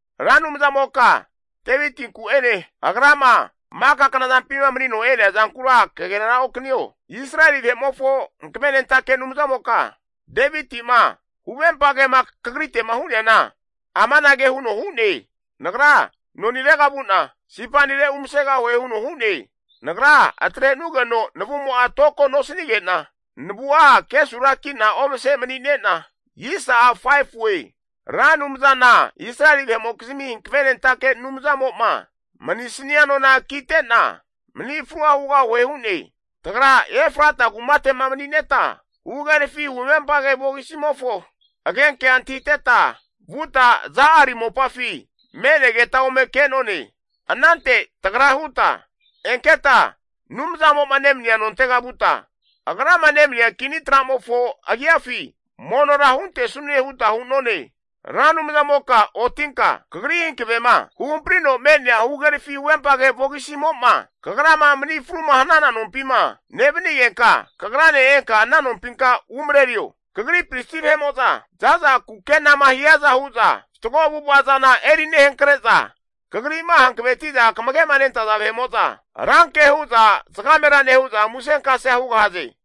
Ra Anumzamoka Devitinku'ene, agrama maka knazampima manino e'neazankura kaganera okanio. Israeli vahe'mofo Hankavenentake Anumzamoka Deviti'ma huvempagema kagrite'ma hu'neana, amanage huno hu'ne, nagra nonirega vu'na, siparera uomasegahue huno hu'ne. Nagra atre'nugeno navumo'a toko nosanige'na, navua kesuraki'na omase manine'na, Ra Anumzana Israeli vahe'mokizmi hankavenentake Anumzamo'ma manisania nona kite'na, mani frua hugahue hu'ne. Tagra Efrata (Betlehemi) kumate'ma manineta huhagerafi huvempage vogisimofo agenkea antahiteta, vuta Ja'ari mopafi me'negeta ome ke'none. Anante tagra huta, enketa Anumzamo'ma nemania nontega vuta, Agrama nemania kini tra'mofo agiafi monora huntesanune huta hu'none. Ra Anumzamoka otinka Kagri hankavema huhamprino me'nea huhagerafi huvempage vogisimo'ma, Kagrama mani fruma hanana nompima nevanigenka, Kagrane enka ana nompinka umarerio. Kagri pristi vahe'mo'za za'za kukenama hiaza huza fatgo avu'ava zana eri nehankre'za, Kagri'ma hankavetiza kamage'ma nentaza vahe'mo'za, ranke hu'za zagamera nehu'za musenkasea hugahaze.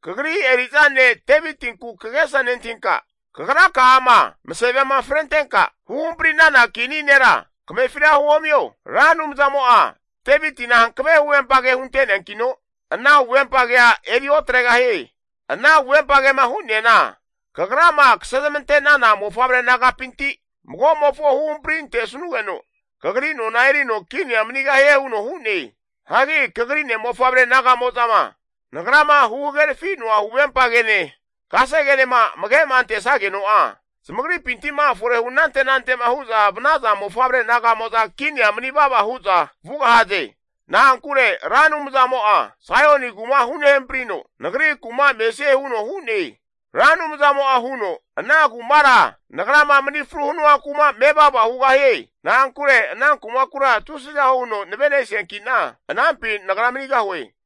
Kagri eri'za ne' Devitinku kagesa nentahinka, Kagraka'ama masavema frentenka huhampari'nana kini nera kamefira huomio. Ra Anumzamo'a Devitina hankave huvempage hunte'neankino, ana huvempagea eri otregahie. Ana huvempa kema hu'neana, kagrama kasezmante'nana mofavre nagapinti mago'mofo huhampri antesnugeno kagri nona erino kinia manigahie, huno hu'ne. Hagi kagri ne'mofavre naga'mo'zama, nagrama huhagerafi'noa huvempa kene, kasegenema amage'ma antesageno'a, zamagripinti'ma fore hu anante anante'ma hu'za vanaza mofavre naga'mo'za kinia mani vava hu'za vugahaze. Na'ankure Ra Anumzamo'a Saion kuma hunehamprino, Nagri kuma mesie huno hu'ne. Ra Anumzamo'a huno, ana kumara nagrama mani fru hanua kuma mevava hugahie. Na'ankure ana kumakura tusiza huno navenesianki'na, anampi nagra manigahue.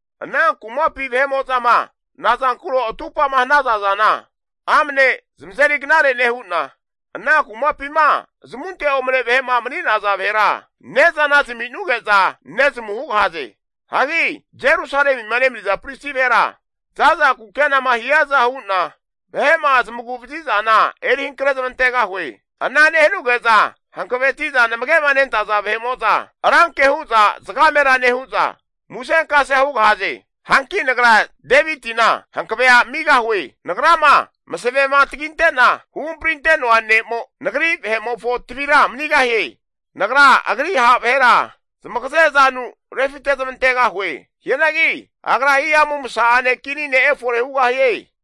Ana kumapi vahe'mo'zama nazankuro atupa'ma hanaza zana, amne zamazeri knare nehu'na, ana kumapima zamunte omane vahe'ma mani'naza vahera ne'zana zami'nuge'za nezamu hugahaze. Hagi Jerusalemima nemaniza pristi vahera za'za kukenama hiaza huna vahe'ma zmaguvazi zana eri hankre zamantegahue. Ana nehanuge'za hankaveti'za namage'ma nentaza vahe'mo'za, ranke hu'za zagamera nehu'za musenkasea hugahaze. Hanki Nagra Devitina hankave'a amigahue. Nagrama masavema taginte'na huhamprinte'noa ne'mo nagri vahe'mofo tavira manigahie. Nagra agri ha' vahera zamagaze zanu refite zmantegahue. Hianagi agra hihamu masa'ane kini ne' efore hugahie.